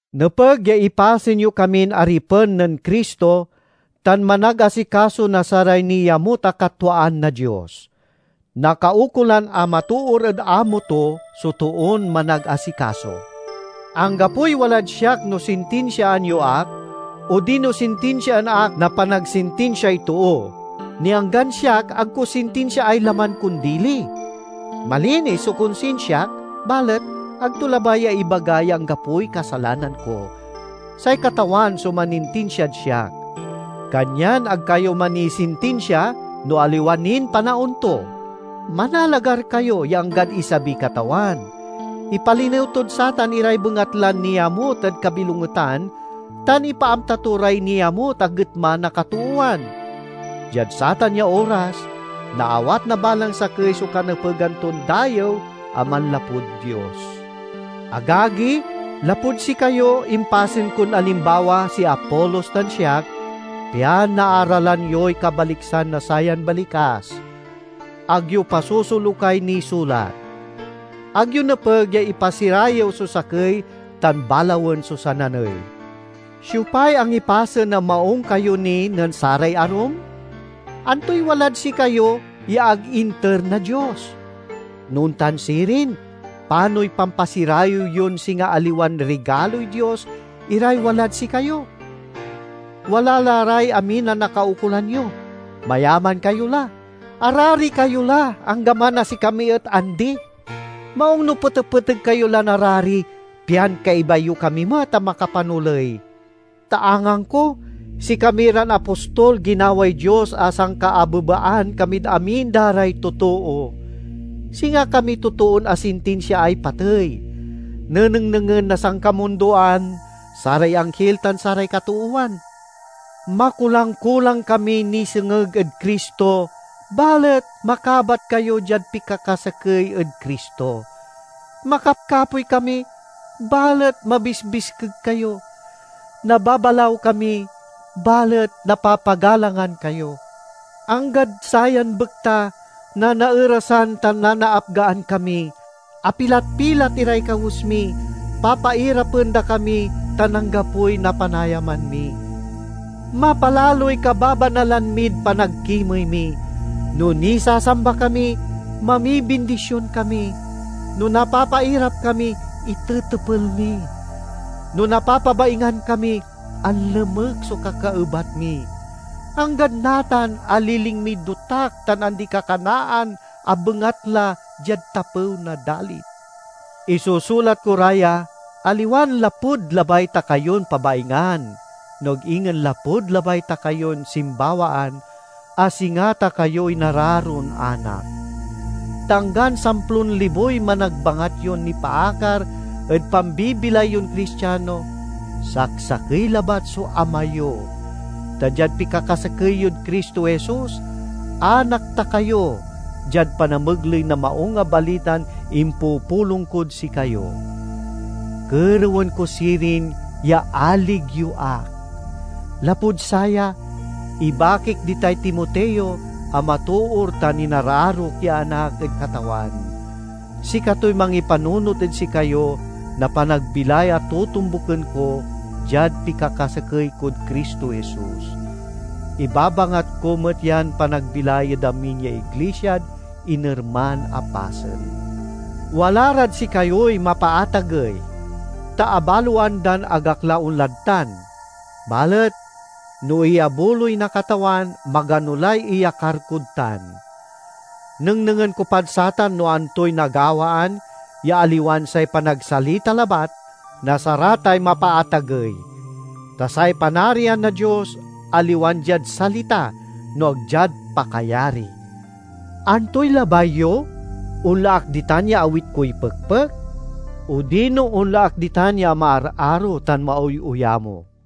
Nepeg ya ipasen yo kamin aripen nen Cristo tan managasikaso na saray niamut a katwaan na Dios. Nakaukolan a matoor ed amo to so toon managasikaso. Anggapoy walad siak no sintinsiaan yo ak, odino sintinsiaan ak na panagsintinsiay too; ni anggan siak ag ko sintinsiaay laman kon dili. Malinis so konsinsiak, balet ag to labay ya ibaga ya anggapoy kasalanan ko. Say Katawan so manintinsiad siak. Kanyan ag kayo manisintinsia no aliwa nin panaon to. Manalagar kayo ya anggad isabiy Katawan. Ipalinew tod satan iray bengatlan niamut ed kabilongetan tan ipaamta to ray niamut a getma na katoowan. Diad satan ya oras, naawat na balang sakey so kanepegan ton dayew a manlapud Dios. Agagi, lapud sikayo, impasen kon alimbawa si Apolos tan siak, pian naaralan yoy kabaliksan na sayan balikas, "Ag yo pasosolukay nisulat." Ag yo nepeg ya ipasirayew so sakey tan balawen so sananey. Siopay angipasen a maung kayo ni nen saray arum? Antoy walad sikayo ya ag inter na Dios? No ontan sirin, panoy pampasirayew yon singa aliwan rigaloy Dios iray walad sikayo? Wala la ray amin a nakaukolan yo! Mayaman kayo la! Arari kayo la, anggaman a sikami et andi! Maung no petepeteg kayo lan arari, pian kaiba yo kami met a makapanoley. Ta angangko, sikami ran apostol ginaway Dios a sankaabebaan kamid amin da ray totoo. Singa kami totoon asintinsiaay patey, nenengnengen na sankamundoan, saray anghil tan saray katoowan. Makulang-kulang kami nisengeg ed Cristo, balet makabat kayo diad pikakasakey ed Cristo! Makapkapoy kami, balet mabisbiskeg kayo! Nababalaw kami, balet napapagalangan kayo! Anggad sayan bekta nanaerasan tan nanaapgaan kami; apilat-pilat iray kawes mi; papairapen da kami tan anggapoy napanayaman mi. Mapalaloy kababanalan mid panagkimey mi. No nisasamba kami, mamibindision kami; no napapairap kami, itetepel mi; no napapabaingan kami, anlemek so kakaebat mi. Anggad natan, aliling miy dotak tan andi-kakanaan a bengatla diad tapew na dalin. Isusulat ko ra ya, aliwan lapud labay ta kayon pabaingan, no ag ingen lapud labay ta kayon simbawaan, a singa ta kayo inararon anak. Ta anggan samplon liboy managbangat yon nipaakar ed pambibilay yon Cristiano, saksakey labat so ama yo. Ta diad pikakasakey yod Cristo Jesus anak ta kayo, diad panamegley na Maung a Balitan impupulong kod sikayo. Kerewen ko sirin ya alig yo ak. Lapud saya, ibakik ditay Timoteo a matoor tan inararok ya anak ed Katawan. Sikatoy mangipanunot ed sikayo na panagbilay a totombuken ko, diad pikakasakey kod Cristo Jesus. Ibabangat ko met yan panagbilay ed amin ya iglisiad inerman a pasen. Wala rad sikayoy mapaatagey, ta abaloan dan ag ak la onlad tan. Balet no iyabuloy na Katawan, magano lay iyakar kod tan. Nengnengen ko pad satan no antoy nagawaan, ya aliwan say panagsalita labat, na saratay mapaatagey! Ta say Panarian na Dios aliwan diad salita, no ag diad pakayari. Antoy labay yo: onla ak ditan ya awit koy pekpek, odino onla ak ditan ya maararo tan maoyoyamo?